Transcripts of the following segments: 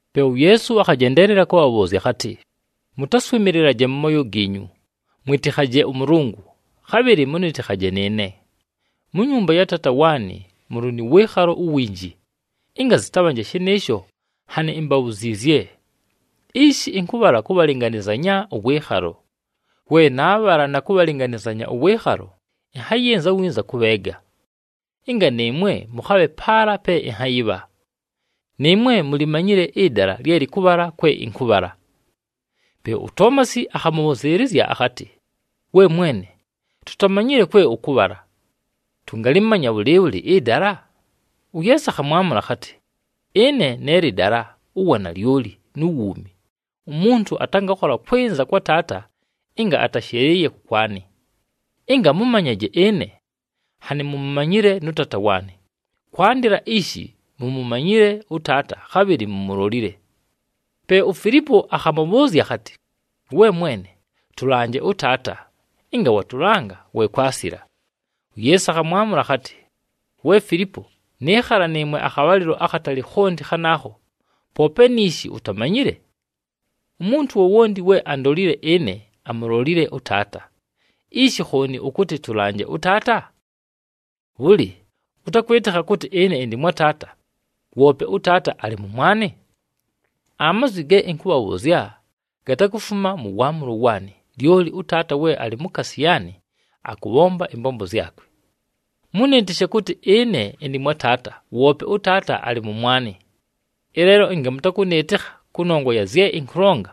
Pe uYeesu akhajendeelela kʉbhabhʉʉzya akhatɨ, “Mʉtaswɨmɨlɨlaje mʉ mooyo giinyu. Mwɨtɨkhaje ʉMʉlʉngʉ, khabhɨlɨ mʉnɨtɨkhaje nɨɨne. Mu nyumba ya Taata waanɨ mʉlɨ nʉ wɨɨkhalo uwinji. Ɨnga zɨtabhanje shɨnɨɨsho, nhanɨ imbabhuziizye. Ishi ɨnkʉbhala kʉbhalɨnganɨzanya ʉwɨɨkhalo. We naabhala na kʉbhalɨnganɨzanya ʉwɨɨkhalo, ɨnhayɨnza winza kʉbheega, ɨnga nɨɨmwe mʉkhabhe paala pe ɨnhayɨbha. Nɨɨmwe mulimanyile ɨdala lye lɨkʉbhala kwe ɨnkʉbhala.” Pe uToomasi akhamʉbhʉzɨɨlɨzya akhatɨ, “We Mwene, tutamanyile kwe ʉkʉbhala. Tʉngalɨmanya bhʉlɨɨbhʉlɨ ɨdala?” UYeesu akhamwamʉla akhatɨ, “Ɨne ne lɨdala, uwanalyoli, nu wuumi. Umuntu atangakhola kwɨnza kwa Taata ɨnga atashɨlɨɨye kʉkwanɨ. Ɨnga mʉmanyaje ɨne, nhanɨ mumumanyile nʉ Taata waanɨ. Kwandɨla ishi, mumumanyile ʉTaata, khabhɨlɨ mumulolile.” Pe uFilipo akhamʉbhʉʉzya akhatɨ, “We Mwene, tʉlanje ʉTaata. Ɨnga watʉlanga, we kwasila.” UYeesu akhamwamʉla akhatɨ, “We Filipo, nɨɨkhala nɨɨmwe akhabhalɨlo akhatali khonti khanaakho, poope niishi utamanyile? Umuntu wowonti we andolile ɨne, amulolile ʉTaata. Ishi khooni ʉkʉtɨ, ‘Tʉlanje ʉTaata’? Bhʉlɨ, ʉtakwɨtɨkha kʉtɨ ɨne ɨndɨ mwa Taata, woope ʉTaata alɨ mʉmwanɨ? Amazwi ge ɨnkʉbhabhʉʉzya gatakufuma mʉ waamʉlo waanɨ, lyoli ʉTaata we alɨ mukaasi yaanɨ, akʉbhomba ɨmbombo zyakwe. Mʉnɨɨtɨshe kʉtɨ ɨne ɨndɨ mwa Taata, woope ʉTaata alɨ mʉmwanɨ. Ɨleelo ɨnga mʉtakʉnɨɨtɨkha kʉnongwa ya zye ɨnkʉlonga,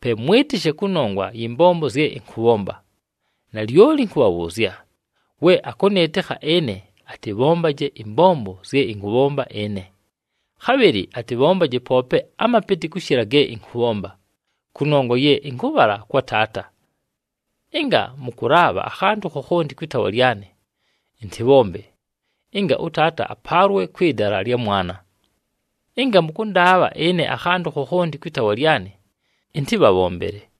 pe mwɨtɨshe kʉnongwa yɨ mbombo zye ɨnkʉbhomba. Nalyoli ɨnkʉbhabhʉʉzya, we akʉnɨɨtɨkha ɨne, atɨbhombaje ɨmbombo zye ɨnkʉbhomba ɨne. Khabhɨlɨ atɨbhombaje poope amapɨtɨ kʉshɨla ge ɨnkʉbhomba, kʉnongwa ye ɨnkʉbhala kwa Taata. Ɨnga mʉkʉlaabha akhantʉ khokhonti kwɨ taawa lyanɨ, ɨntɨbhombe, ɨnga ʉTaata apaalwe kwɨ dala lya Mwana. Ɨnga mʉkʉndaabha ɨne akhantʉ khokhonti kwɨ taawa lyanɨ, ɨntɨbhabhombele.”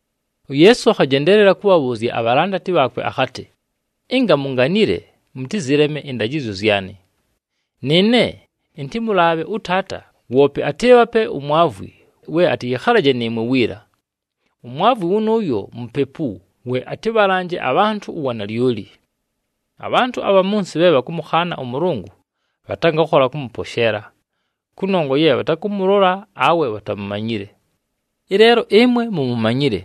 UYeesu akhajendeelela kʉbhabhʉʉzya abhalandati bhaakwe akhatɨ, “Ɨnga munganile, mʉtɨzɨleme ɨndajɨzyo zyanɨ. Nɨɨne ɨntɨmʉlaabhe ʉTaata, woope atɨɨbhape uMwavwi we atɨyɨkhalaje nɨɨmwe wiila. UMwavwi wʉnʉʉyo Mupepu we atɨbhalanje abhantʉ uwanalyoli. Abhantʉ abha mʉ nsɨ bhe bhakʉmʉkhaana ʉMʉlʉngʉ bhatangakhola kʉmʉposheela, kʉnongwa ye bhatakʉmʉlola awe bhatamumanyile. Ɨleelo ɨmwe mumumanyile,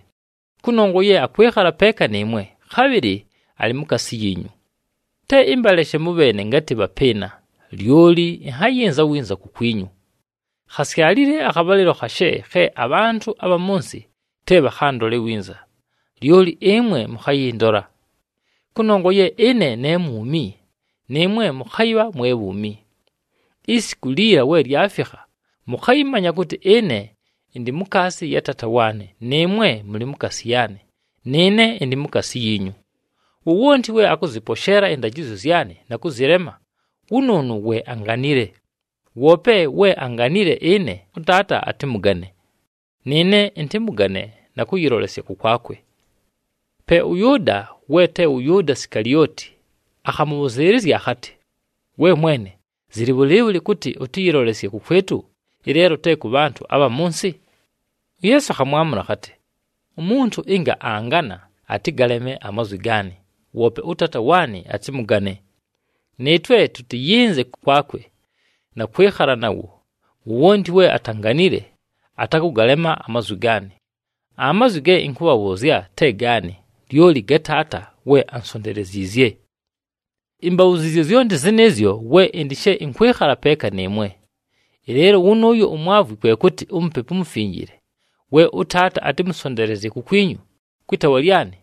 kʉnongwa ye akwɨkhala peeka nɨɨmwe, khabhɨlɨ alɨ mukaasi yiinyu. “Te ɨmbaleshe mʉbheene ngatɨ bhapɨɨna, lyoli ɨnhayɨnza winza kukwinyu. Khasyalile akhabhalɨlo khashe khe abhantʉ abha mʉ nsɨ te bhakhandole winza, lyoli ɨmwe mʉkhayɨndola. Kʉnongwa ye ɨne ne mwumi, nɨɨmwe mʉkhayɨbha mwe bhuumi. Isiku liila we lyafikha, mʉkhayɨmanya kʉtɨ ɨne ɨndɨ mukaasi ya Taata waanɨ, nɨɨmwe mʉlɨ mukaasi yaanɨ, nɨɨne ɨndɨ mukaasi yiinyu. Wowonti we akʉzɨposheela ɨndajɨzyo zyanɨ na kʉzɨlema, wʉnʉʉnʉ we anganile. Woope we anganile ɨne, ʉTaata atɨmʉgane, nɨɨne ɨntɨmʉgane na kʉyɨlolesya kʉkwakwe.” Pe ʉYʉʉda, we te wʉ Yʉʉda Sikalioti, akhamʉbhʉzɨɨlɨzya akhatɨ, “We Mwene, zɨlɨ bhʉlɨɨbhʉlɨ kʉtɨ ʉtɨyɨlolesye kʉkwɨtʉ, ɨleelo te kʉ bhantʉ abha mʉ nsɨ?” UYeesu akhamwamʉla akhatɨ, “Umuntu ɨnga angana, atɨgaleme amazwi gaanɨ, woope ʉTaata waanɨ atɨmʉgane. Nɨɨtwe tʉtɨyɨnze kʉkwakwe na kwɨkhala nawo. Wowonti we atanganile atakʉgalema amazwi gaanɨ. Amazwi ge ɨnkʉbhabhʉʉzya te gaanɨ, lyoli ga Taata we ansonteleziizye. “Imbabhuziizye zyonti zɨnɨɨzyo we ɨndɨ she ɨnkwɨkhala peeka nɨɨmwe. Ɨleelo wʉnʉʉyo uMwavwi kwe kʉtɨ, uMupepu uMufinjile we ʉTaata atɨmʉsonteelezye kukwinyu kwɨ taawa lyanɨ,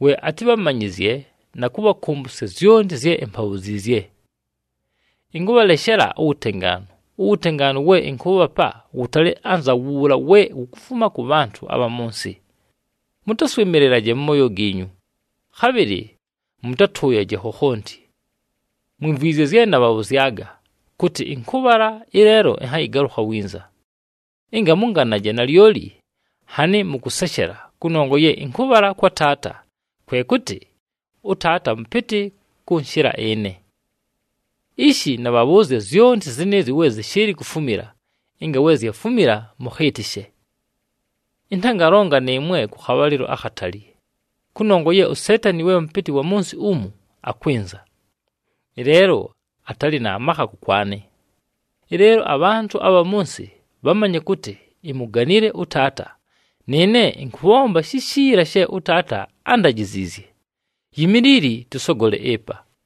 we atɨbhamanyɨzye na kʉbhakʉmbʉsya zyonti zye imbabhuziizye. Ɨnkʉbhaleshela uwutengaanu, uwutengaanu we ɨnkʉʉbhapa wʉtalɨ anza wuula we wukufuma kʉ bhantʉ abha mʉ nsɨ. Mʉtaswɨmɨlɨlaje mʉ mooyo giinyu, khabhɨlɨ mʉtatʉʉyaje khokhonti. Mwimvwizye zye nabhabhʉzyaga kʉtɨ, ‘Ɨnkʉbhala, ɨleelo ɨnhayɨgalʉkha winza.’ Ɨnga mʉnganaje nalyoli, nhanɨ mʉkʉseshela kʉnongwa ye ɨnkʉbhala kwa Taata, kwe kʉtɨ ʉTaata mʉpɨtɨ kʉnshɨla ɨne. “Ishi nabhabhʉʉzya zyonti zɨnɨɨzyo we zɨshɨɨlɨ kufumila, ɨnga we zyafumila, mʉkhɨɨtɨshe. Ɨntangalonga nɨɨmwe kʉ khabhalɨlo akhatali, kʉnongwa ye uSeetani we mʉpɨtɨ wa mʉ nsɨ umu, akwɨnza. Ɨleelo atalɨ na makha kʉkwanɨ. Ɨleelo abhantʉ abha mʉ nsɨ bhamanye kʉtɨ imuganile ʉTaata, nɨɨne ɨnkʉbhomba shishiila she ʉTaata ándajiziizye. Yimiilili tʉsogole ɨpa.”